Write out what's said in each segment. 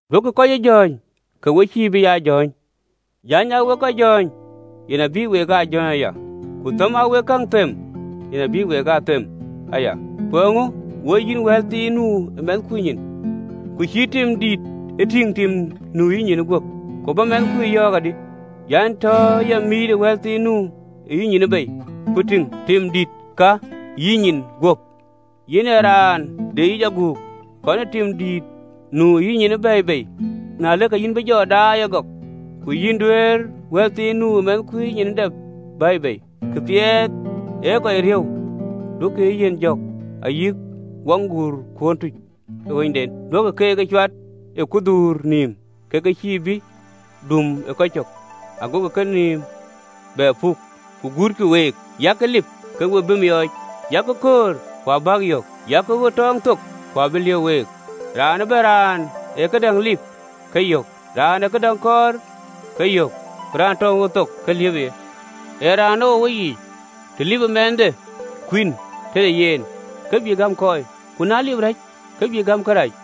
Duökï kɔc ë jɔ̈ɔ̈ny, ke we cïï bï aa jɔ̈ɔ̈ny. 2.Jäny aa we kɔc jɔ̈ɔ̈ny, yen abï wek aa jɔ̈ɔ̈ny aya, ku thëm aa wek käŋ them, yen, abï week aa them aya. Ku eeŋö woi yïn wɛ̈ɛ̈lthiin nu ë mɛnhkui nyin, ku cïï tim dït ë tïŋ tim nu ë yïnyin guöp? Ku bä mɛnhkui yɔ̈ɔ̈k adï an, “Tɔ ya mïït wɛ̈ɛ̈lthiin nu ë yïnyin bei, ku tïŋ, tim dït ka ë yïnyin guöp? Yïn ee raan deyic aguk, kɔn tim dït nu ë yïnyin bɛ̈ɛ̈i bei, na ëlë, ke yïn bï daai ëgɔk ku yïn duëër wɛ̈ɛ̈lthiin nu ë mɛnhkui nyin dap bɛ̈ɛ̈i bei. “Këpiɛth ɣeric duökï ee yiɛ̈n jɔ̈k, ayï waŋguurkuön tuc ë ɣööcden duökï keek ë cuat kudhuur nïïm, ke ke cïï ke bï dum ë kecök, agokï kenïïm bɛ puk, guutkï week. Yak lip, ke we bï miɔɔc, yak köör, ku abäk yök, yak ɣöt tɔɔŋ thok, ku abï liëp week. Raan ëbɛ̈n raan ë këdäŋ lip, ke yök, raan ë këdäŋ kɔɔr, ke yök, ku raan tɔŋ ɣöt thok, ke liëpë yen. Ee raanou në weyiic, të lipë mɛnhde kuïn tëde yen, ke bï gäm kɔɔi? Ku na lip rɛ̈c, ke bï gäm kërac?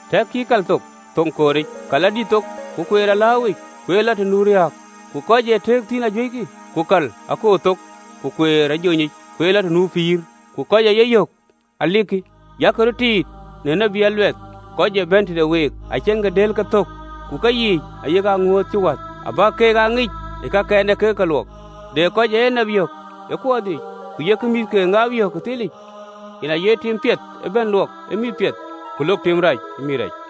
Tɛ̈kkï ë kal thok, thoŋ kooric, kal adït thok, ku kueer alääuwic kueer lɔ të nu riääk, ku kɔc ee tëëk thïn ajuëckï. Ku kal akoor thok, ku kueer ajonyic, kueer lɔ të nu pïïr, ku kɔc ë ye yök alikï. Yak röt tiit në tït aluɛth, kɔc ee bɛ̈n tëde week ke ke ceŋ dël ke thök, ku keyiic thïn ayak aŋuööth cï wäth. Abäk ke ŋic në kakɛn yek kek luɔk. De kɔc ë enap yök ë kuɔɔth yiic, ku yek mïth ke ŋaap yök ë thilic? Yen aye tim piɛth ëbɛ̈n luɔk ë mïth piɛth, ku lok tim rac në mïth rac.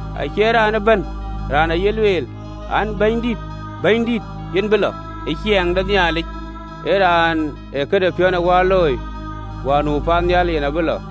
Acie raan ëbɛ̈n raan ee ye lueel, an, Bɛ̈nydït, Bɛ̈nydït, yen bï lɔ ë ciɛɛŋ de Nhialic, ee raan ë këde piɔ̈u ë wäär looi, wäär nu paannhial yen abï lɔ.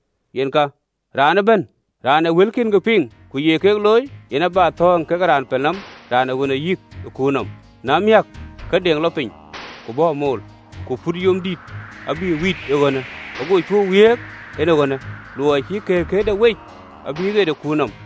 Yen ka, raan ëbɛ̈n raan ë wëlkiënë piŋ, ku ye ke looi, yen abä thɔ̈ɔ̈ŋ kekë raan pelnɔm, raan ë ɣönde yïk ë kuur nɔm, na miäk, ke deŋ lɔ piny, ku bɔ̈ amool, ku put yom dït, abïk wït ee ɣönë, go cuö wiëëk, en ë ɣönë, luɔi cï këërkëërde wec abï ɣet ë kuur nɔm.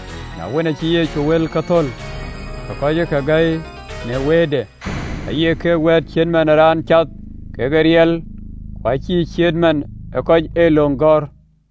Na wën, acï Yecu wëlkë thöl, ke kɔc ë ke gäi në wëëtde, aye keek wɛ̈ɛ̈t cït man ë raan cath ke riɛl ku cïï cït man ë kɔc ë löŋ gɔ̈ɔ̈r.